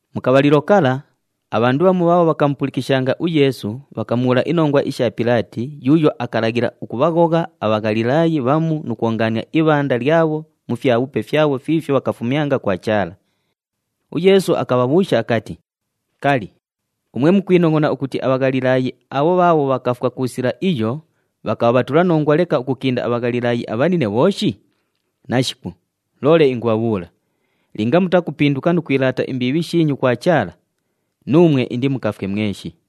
Mu kabhalilo kala, abhandu bhamu bhaabho bhakamupulikishanga uYeesu bhakamubhuula inongwa isha Pilaati yuuyo akalaghila ukubhaghogha aBhaghalilaayi bhamu nu kwongaania ibhanda lyabho mu fyabhupe fyabho fiifyo bhakafumyanga kwa Chaala. UYeesu akabhabhuusha akati, “Kali, umwe mukwinongʼona ukuti aBhaghalilaayi abho bhaabho bhakafwa ku sila iyo bhakabha bhatulanongwa leka ukukinda aBhaghalilaayi abhanine bhooshi? Nashiku! Loole ingubhabhuula, linga mutakupinduka nu kwilaata imbiibhi shiinyu kwa Chaala, nuumwe indimukafwe mweshi!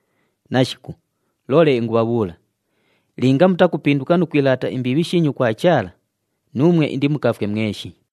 Nashiku! Loole ingubhabhuula, linga mutakupinduka nu kwilaata imbiibhi shiinyu kwa Chaala, nuumwe indimukafwe mweshi!”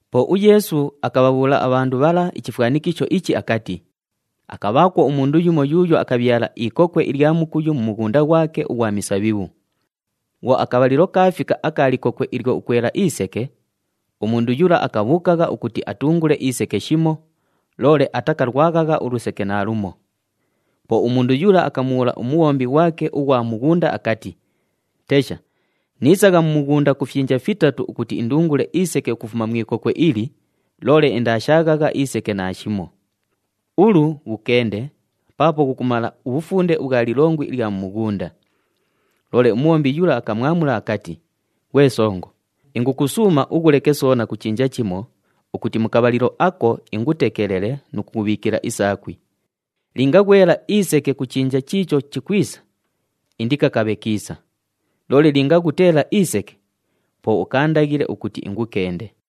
Po uYeesu akabhabhuula abhandu bhala ichifwanikisho ichi akati, “Akabhaakwo umundu yumo yuuyo akabhyala ikokwe ilya mukuyu mu mughunda ghwake ughwa misabhibhu. Bhwo akabhalilo kaafika aka likokwe ilyo ukwela iseke, umundu yula akabhuukagha ukuti atungule iseke shimo, loole atakalwaghagha uluseke naalumo. Po umundu yula akamubhuula umubhombi ghwake ughwa mughunda akati, ‘Tesha! Niisagha mu mughunda ku fyinja fitatu ukuti indungule iseke ukufuma mu ikokwe ili, loole indaashaaghagha iseke naashimo! Ulu, ghukende paapo ghukumala ubhufunde ubhwa lilongwi ilya mu mughunda!’ “Loole umubhombi yula akamwamula akati, ‘Ghwe songo, ingukusuuma ughuleke soona ku chinja chimo ukuti mu kabhalilo ako ingutekelele nu kubhiikila isaakwi. Linga ghwela iseke ku chinja chiicho chikwisa, indikakabhe kiisa! Loole linga ghuteela iseke, po ukaandaghile ukuti ingukende.’”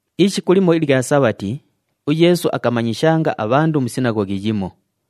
Ishiku limo ilya Sabhati, uYeesu akamanyishanga abhandu mu sinaghoghi yimo.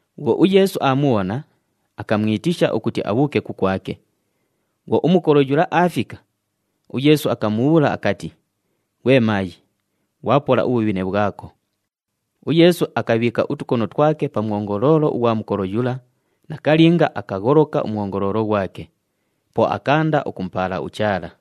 Bhwo uYeesu aamubhona, akamwitisha ukuti abhuuke kukwake. Bhwo umukolo yula aafika, uYeesu akamubhuula akati, “Ghwe maayi, ghwapola ubhubhine bhwako!” UYeesu akabhiika utukono twake pa mwongoloolo ughwa mukolo yula, nakalinga akagholoka umwongoloolo ghwake. Po akaanda ukumupaala uChaala.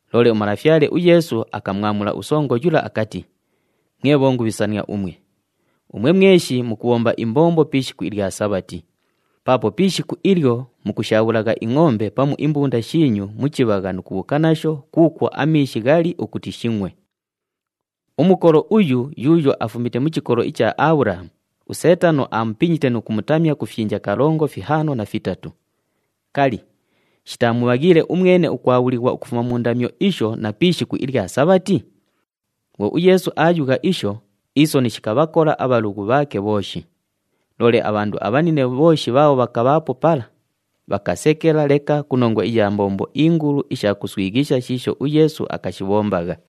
Loole uMalafyale uYeesu akamwamula usongo yula akati, “Mwe bhongubhisania umwe! Umwe mweshi mukubhomba imbombo pi ishiku ilya Sabhati. Paapo pi ishiku ilyo mukushaabhulagha ingʼombe pamu imbunda shiinyu mu chibhagha nu kubhuuka nasho kuukwo amiishi ghali ukuti shingʼwe. Umukolo uyu yuuyo afumite mu chikolo icha Abhulahamu, uSeetano aamupinyite nu kumutamya ku fyinja kalongo, fihaano na fitatu. Kali, shitaamubhaghiile umwene ukwabhulighwa ukufuma mu ndamyo isho na pi ishiku ilya Sabhati?” Bhwo uYeesu aayugha isho, isoni shikabhakola abhalughu bhaake bhooshi. Loole abhandu abhanine bhooshi bhaabho bhakabhaapo pala bhakasekela leka ku nongwa iya mbombo ingulu isha kuswighisha shiisho uYeesu akashibhombagha.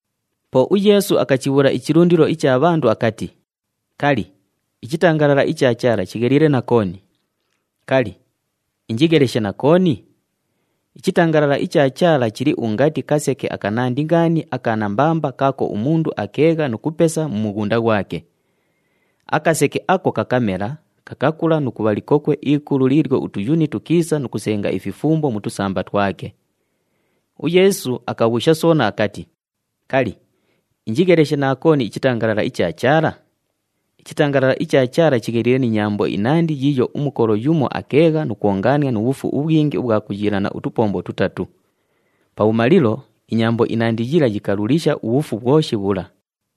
Po uYeesu akachibhuusha ichilundilo icha bhandu akati, “Kali, ichitangalala icha Chaala chigheliile na kooni? Kali, injigheleshe na kooni? Ichitangalala icha Chaala chili ungati kaseke akanandi ngaani aka nambamba kaako umundu akeegha nu kupesa mu mughunda ghwake. Akaseke ako kakamela, kakakula nu kubha likokwe ikulu liilyo utuyuni tukiisa nu kusenga ififumbo mu tusamba twake.” UYeesu akabhuusha soona akati, “Kali, injigheleshe na kooni ichitangalala icha Chaala? Ichitangalala icha Chaala chigheliile ni nyambo inandi yiiyo umukolo yumo akeegha nu kwongaania nu bhufu ubhwingi ubhwa kuyiilana utupombo tutatu. Pabhumalilo, inyambo inandi yila yikalulisha ubhufu bhwoshi bhula.”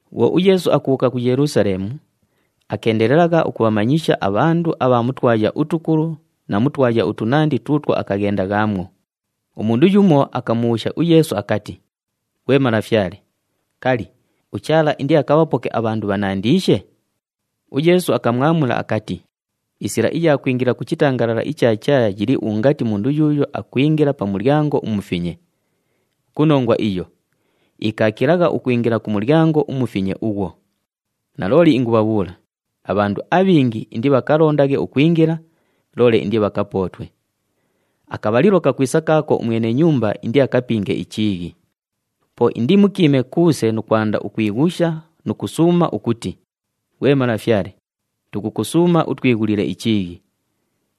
Bhwo uYeesu akubhuuka ku Yelusaleemu, akeendelelagha ukubhamanyisha abhandu abha mu twaya utukulu na mu twaya utunandi tuutwo akaghendaghaamwo. Umundu yumo akamubhuusha uYeesu akati, “Ghwe Malafyale, kali, uChaala indiakabhapoke abhandu bhanandiishe?” UYeesu akamwamula akati, “Isila iya kwingila ku chitangalala icha Chaala yili ungati mundu yuuyo akwingila pa mulyango umufinye. Ku nongwa iyo, ikaakilagha ukwingila ku mulyango umufinye ughwo. Nalooli ingubhabhuula, abhandu abhingi indibhakalondaghe ukwingila, loole indibhakapootwe. Akabhalilo kakwisa kaako umwene nyumba indiakapinge ichiighi. Po indimukiime kuuse nu kwanda ukwighusha nu kusuuma ukuti, ‘Ghwe malafyale, tukukusuuma utwighulile ichiighi!’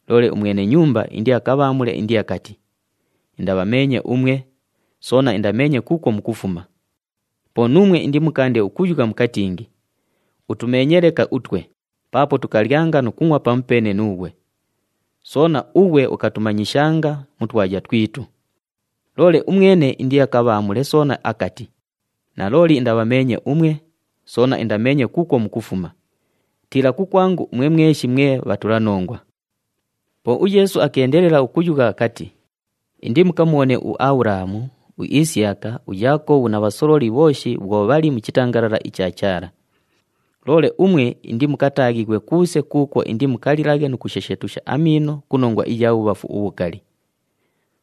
Loole umwene nyumba indiakabhaamule indiakati, ‘Indabhameenye umwe, soona indameenye kuukwo mukufuma!’ Po nuumwe indimukaande ukuyugha mukatingi, ‘Utumeenye leka utwe, paapo tukalyanga nu kungʼwa pamupeene nuughwe! Soona, ughwe ukatumanyishanga mu twaya twitu!’ Loole umwene indiakabhaamule soona akati, ‘Nalooli indabhameenye umwe, soona indameenye kuukwo mukufuma! Tiila kukwangu umwe mweshi mwe bhatulanongwa!’” Po uYeesu akeendelela ukuyugha akati, “Indimukamubhone uAbhulahamu, uIsiyaka, uYaakobhu na bhasololi bhooshi bhwo bhali mu chitangalala icha Chaala. Loole umwe indimukataaghighwe kuuse kuukwo indimukalilaghe nu kushesheetusha amiino ku nongwa iya bhubhafu ubhukali!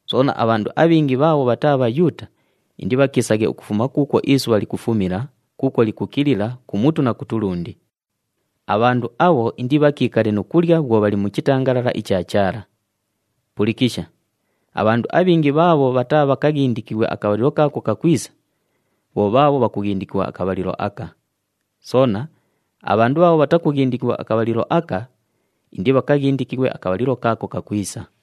Soona, abhandu abhingi bhaabho bhataa Bhayuuta indibhakiisaghe ukufuma kuukwo isubha likufumila, kuukwo likukilila, kumutu na kutulundi. Abhandu abho indibhakiikale nu kulya bhwo bhali mu chitangalala icha Chaala. “Pulikisha! Abhandu abhingi bhaabho bhataabhakaghindikighwe akabhalilo kaako kakwisa, bho bhaabho bhakughindikighwa akabhalilo aka. Soona, abhandu bhaabho bhatakughindikighwa akabhalilo aka, indibhakaghindikighwe akabhalilo kaako kakwisa.”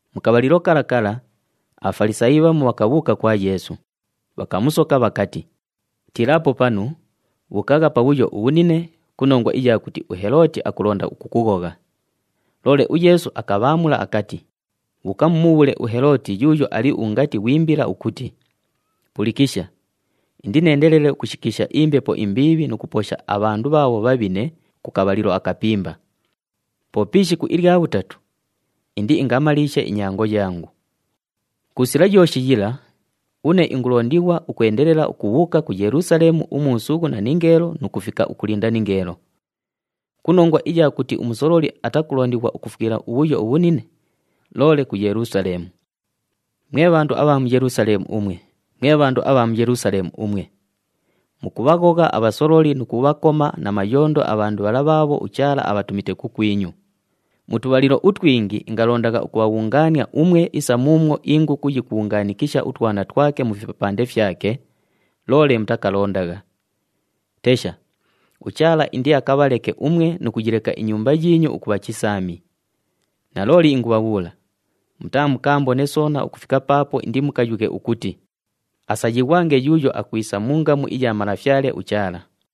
Mu kabhalilo kala kala, aBhafalisaayi bhamu bhakabhuuka kwa Yeesu, bhakamusoka bhakati, “Tiilaapo panu, bhuukagha pabhuyo ubhunine ku nongwa iya kuti uHelooti akulonda ukukughogha.” Loole uYeesu akabhaamula akati, “Bhuuka mumubhuule uHelooti yuuyo ali ungati ghwi mbila ukuti, ‘Pulikisha! Indineendelele ukushikiisha imbepo imbiibhi nu kuposha abhandu bhaabho bhabhine ku kabhalilo akapimba. Po pi ishiku ilya bhutatu, indiingamaliishe inyango yangu. Ku sila yooshi yila, une ingulondighwa ukwendelela ukubhuuka ku Yelusaleemu umuusughu na ningeelo nu kufika ukulinda ningeelo. Ku nongwa iya kuti umusololi atakulondighwa ukufwila ubhuyo ubhunine, loole ku Yelusaleemu!’ “Mwe bhandu abha mu Yelusaleemu umwe, mwe bhandu abha mu Yelusaleemu umwe! Mukubhaghogha abhasololi nu kubhakoma na mayondo abhandu bhala bhaabho uChaala abhatumite kukwinyu. Mu tubhalilo utwingi ingalondagha ukubhabhungaania umwe isa muumwo inguku yikubhungaanikisha utwana twake mu fipapande fyake, loole mutakalondagha. Tesha, uChaala indiakabhaleke umwe nu kuyileka inyumba yiinyu ukubha chisaami! Nalooli ingubhabhuula, mutaamukaambone soona ukufika paapo indimukayughe ukuti, ‘Asayighwange yuuyo akwisa mu ngamu iya Malafyale uChaala.’”